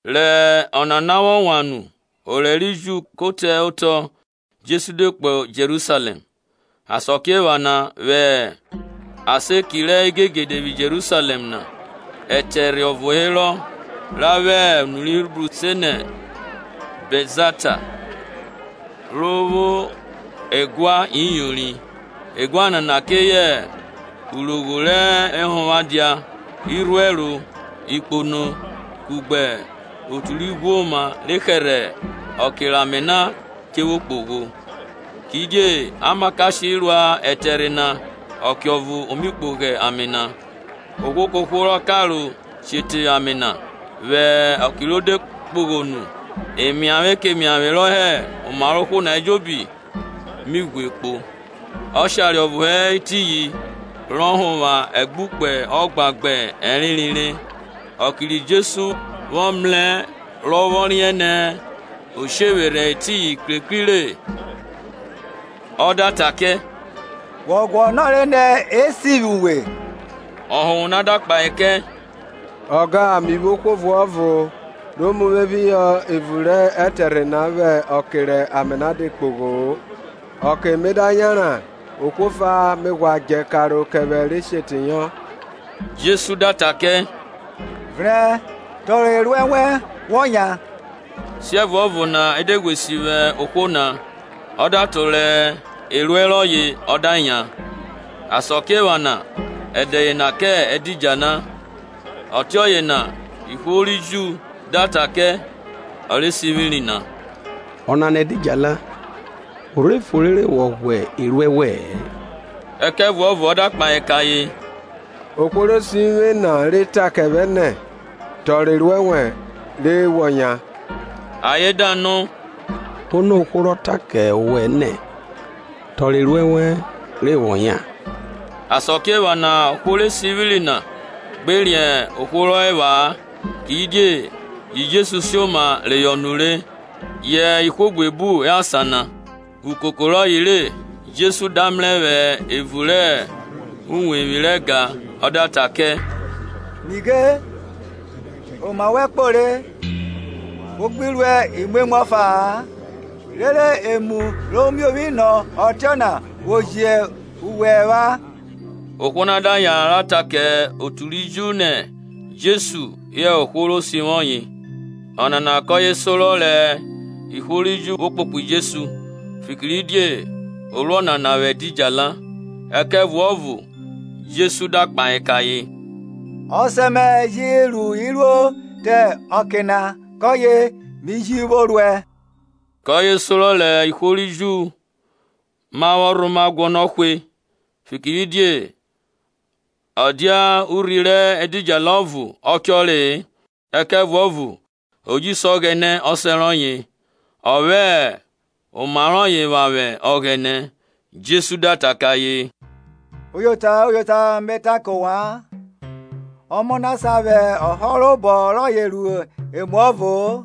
Rẹ ọnana vwọ wan nu orẹ ri Ju ko te otọ, Jesu de kpo Jerusalẹm. Asakiephana vwẹ asan eki rẹ igegede vwi Jerusalẹm na ẹtẹrhe ọvo herọ, ra vwẹ unu ri Hibru se nẹ Bẹtzata, ro vwo ẹguan iyori. Eguan nana keye urogho rẹ ehonvwo dia, irhuẹro, ikpono, kugbe otu ri ghwoma re hẹrhẹ ọke rẹ ame na dẹ che kpogho. Kidie amakashe ruẹ ẹtẹrhe na ọkeọvo o mi kpogho ame na ohwo kohwo rọ karo she teyọ ame na vwẹ ọke ro de kpogho nu, emiavwe kemiavwe rọ hẹ oma rọye ejobi mi ghwe kpo. Ọshare ọvo hẹ etiyin, rọ họnvwa ẹgbukpe ọgban gbẹ ẹrenre re. Ọke ri Jesu vwọ mrẹ rọ vwọ riẹn nẹ o shevwerhẹ etiyin krekri re, ọ da ta kẹ, Wọ guọnọre nẹ esivwi uwe? Ọhonvwo na da kpahe kẹ, Ọga, mi vwo ohwo ọvuọvo ro mu vwe phihọ evun rẹ ẹtẹrhe na vwẹ ọke rẹ ame na de kpogho-o, ọke me da yanran ohwo ọfa me ghwa djẹ karo kẹ vwẹ re she teyọ. Jesu da ta kẹ, Vrẹn, tọrọ eruẹ wẹn, wọ yan. Siẹvuọvo na e de ghwe sivwi ohwo na, ọ da tọrọ eruẹ rọye ọ da yan. Asakiephana ẹdẹ yena kẹ ẹdidjala. Ọtiọye na ihwo ri Ju da ta kẹ ọ re sivwiri na, Ọnana ẹdidjala, o rhe fo rere wọ ghwa eruẹ wẹ-ẹn. Ẹkẹvuọvo ọ da kpahe kẹ ayen. Ohwo ro sivwi uvwe na re ta kẹ vwẹ nẹ, Tọrọ eruẹ wẹn, re wọ yan. Ayen da nọ, Ono hẹ ohwo rọ ta kẹ owẹ nẹ, Tọrọ eruẹ wẹn, re wọ yan? Asakiephana ohwo re sivwiri na gbe riẹn ohwo rọ e pha-a, kidie yi Jesu sioma reyọ nure, yẹ ihwo buebu hẹ asan na. Ukuko rọye re, Jesu da mrẹ vwẹ evun rẹ uwevwi rẹ ẹga na, ọ da ta kẹ, Nighe, oma wẹ kpo re. Wo gbi ruẹ imwemwu ọfa-a, rere emu ro miovwi nọ ọtiọna vwo jẹ uwe ẹvwa. Ohwo na da yanran ra ta kẹ otu ri Ju nẹ Jesu hẹ ohwo ro sivwi ọye. Ọnana kọye sorọ rẹ ihwo ri Ju vwo kpokpo Jesu, fikiridie o ru ọnana vwẹ ẹdidjala. Ẹkẹvuọvo Jesu da kpahe kẹ ayen, Ọsẹ mẹ ji ru iruo te ọke na, kọye mi ji vwo ruẹ. Kọye sorọ rẹ ihwo ri Ju na vwọ rhoma guọnọ hwe, fikiridie ọ dia urhi rẹ ẹdidjala ọvo ọ chọre-e, ẹkẹvuọvo o ji se Ọghẹnẹ Ọsẹ rọye, ọ vwẹ oma rọye vwavwẹ Ọghẹnẹ. Jesu da ta kẹ ayen, Uyota, uyota, me ta kẹ ovwan, Ọmọ na sa vwẹ ọhọrobọ rọye ru emuọvo-o,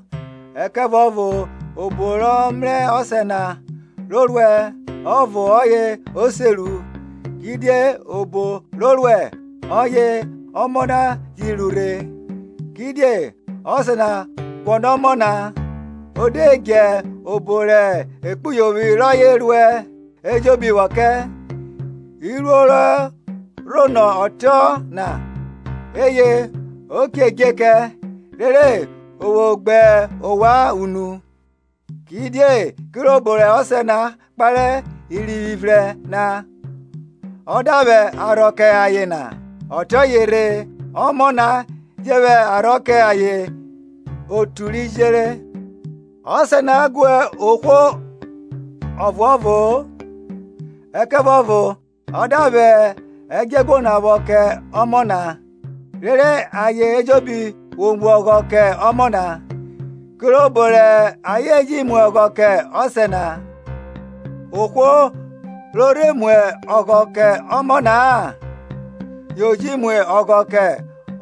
ẹkẹvuọvo obo rọ mrẹ Ọsẹ na ro ruẹ ọvo ọye o se ru; kidie obo ro ruẹ, ọye Ọmọ na ji ru rhe. Kidie Ọsẹ na guọnọ Ọmọ na, o de dje obo rẹ ekpuyovwi rọye ruẹ ejobi vwọ kẹ; iruo re rhonọ ọtiọna eye o che dje kẹ, rere o vwo gbe ovwan unu. Kidie kirobo rẹ Ọsẹ na kpare irivwi vrẹn na ọ da vwẹ arhọ kẹ ayen na, ọtiọye rhe Ọmọ na je vwẹ arhọ kẹ ayen otu ri jere. Ọsẹ na gu ohwo ọvuọvo-o, ẹkẹvuọvo ọ da vwẹ ẹdjọeguo na vwọ kẹ Ọmọ na, rere ayen ejobi vwo mu ọghọ kẹ Ọmọ na, kirobo rẹ ayen ji mu ọghọ kẹ Ọsẹ na. Ohwo ro rhe mu ọghọ kẹ Ọmọ na-a yo ji mu ọghọ kẹ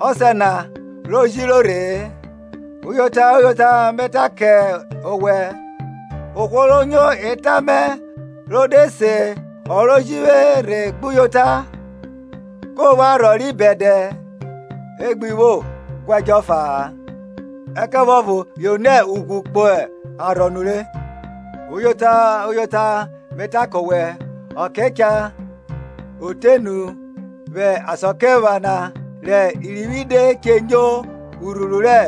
Ọsẹ na ro jiro rhe-e. Uyota, uyota, me ta kẹ owẹ, ohwo ro nyo eta mẹ rọ de se ọ ro ji vwe rhe gbuyota, ko vwo arhọ ri bẹdẹ; e gbi vwo guẹdjọ ọfa-a, ẹkẹvuọvo yo nẹ ughwn kpo arhọ nure. Uyota, uyota, me ta kẹ owẹ, ọke cha, o te nu vwẹ asakiephana rẹ irivwi de che nyo urhuru rẹ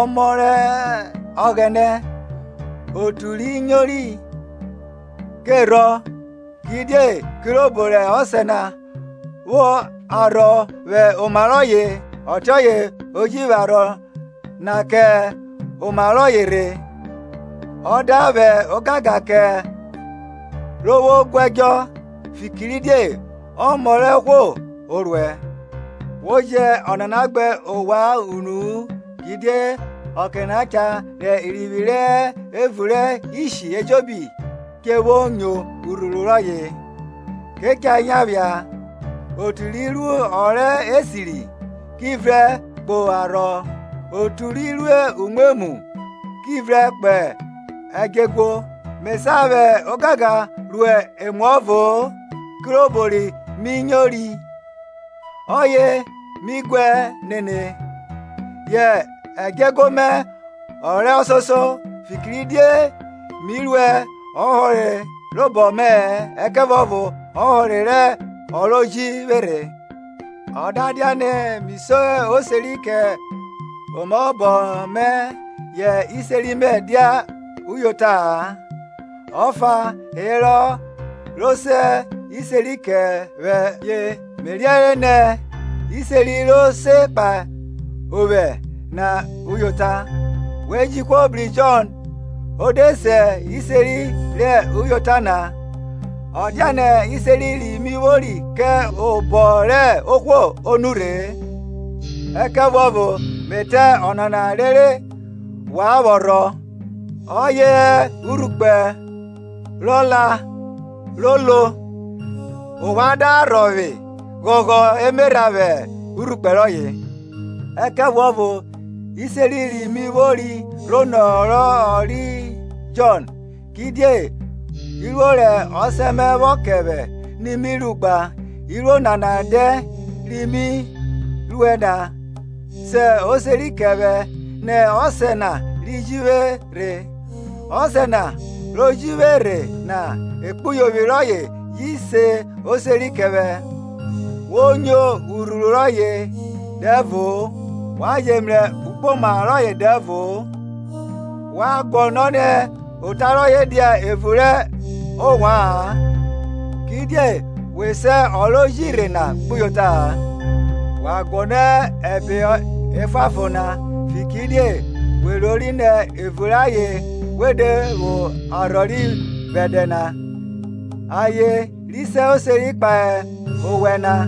Ọmọ rẹ Ọghẹnẹ, otu ri nyori ke rhọ. Kidie kirobo rẹ Ọsẹ na vwo arhọ vwẹ oma rọye, ọtiọye ọ je vwẹ arhọ na kẹ oma rọye rhe, ọ da vwẹ ogangan kẹ ro vwo guẹdjọ, fikiridie Ọmọ rẹ ohwo o ruẹ. Wo jẹ ọnana gbe ovwan unu-u; kidie ọke na cha rẹ irivwi rẹ hẹ evun rẹ ishi ejobi che vwo nyo urhuru rọye. Ke cha yan phia, otu ri ru ọ rẹ esiri, ki vrẹn kpo arhọ, otu ri ru umwemwu, ki vrẹn kpo ẹdjọeguo. Me sa vwẹ ogangan ru emuọvo-o; kirobo ri mi nyori, ọye mi guẹ nene; yẹ ẹdjọeguo mẹ ọ rẹ ọsoso, fikiridie mi ruẹ ọhọrobọ mẹ-ẹ ẹkẹvuọvo ọhore rẹ ọ ro ji vwe rhe. O da dianẹ mi se oseri kẹ omaobọ mẹ, yẹ iseri mẹ dia uyota-a; ọfa herọ ro se iseri kẹ vwẹ, ye me riẹnre nẹ iseri ro se kpahe ovwẹ na uyota. We ji ohwo bru Jọn, o de se iseri rẹ uyota na. Ọ dianẹ iseri ri mi vwori kẹ obọ rẹ ohwo o nurhe-e; ẹkẹvuọvo me ta ọnana rere wan vwọ rhọ. Ọye hẹ urhukpẹ rọ la ro lo, ovwan da rhọvwe ghọghọ emerha vwẹ urhukpẹ rọye. Ẹkẹvuọvo iseri ri mi vwori rhonọ ọ ri Jọn; kidie iruo rẹ Ọsẹ mẹ vwọ kẹ vwẹ ni mi ru gba, iruo nana dẹn ri mi ruẹ na, se oseri kẹ vwẹ nẹ Ọsẹ na ri ji vwe rhe. Ọsẹ na ro ji vwe rhe na ekpuyovwi rọye ji se oseri kẹ vwẹ. We nyo urhuru rọye dẹvo-o, wa je mrẹ ugboma rọye dẹvo-o; wa guọnọ nẹ ota rọye dia evun rẹ ovwaan, kidie we se ọ rọ ji rhe na gbuyota-a. Wa guọnọ ẹbe efuanfon na, fikiridie we rori nẹ evun rẹ ayen we de vwo arhọ ri bẹdẹ na; ayen ri se oseri kpahe ovwẹ na;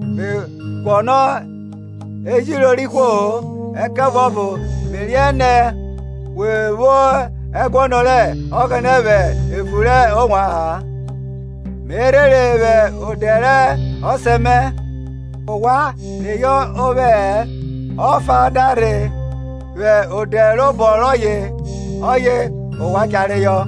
Me guọnọ ejiro rẹ ihwo-o. Ẹkẹvuọvo me riẹnre nẹ we vwo ẹguọnọ rẹ Ọghẹnẹ vwẹ evun rẹ ovwa-an. Me rhere vwẹ odẹ rẹ Ọsẹ mẹ, ovwan reyọ ovwẹ-ẹ; ọfa da rhe vwẹ ode robọ rọye, ọye ovwan cha reyọ.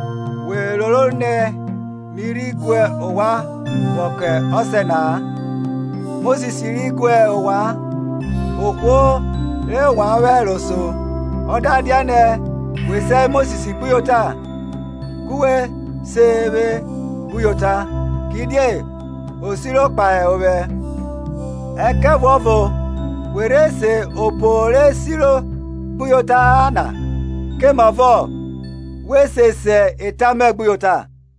We roro nẹ mi rhi gu ovwan vwọ kẹ Ọsẹ na-a; Mosis ri guẹ ovwan, ohwo re wa vwẹ ẹro so. Ọ da dianẹ we se Mosis gbuyota, ku we se vwe gbuyota, kidie o siro kpahe ovwẹ. Ẹkẹvuọvo we rhe se obo ro siri gbuyota-a na, komavọ we se se eta mẹ gbuyota.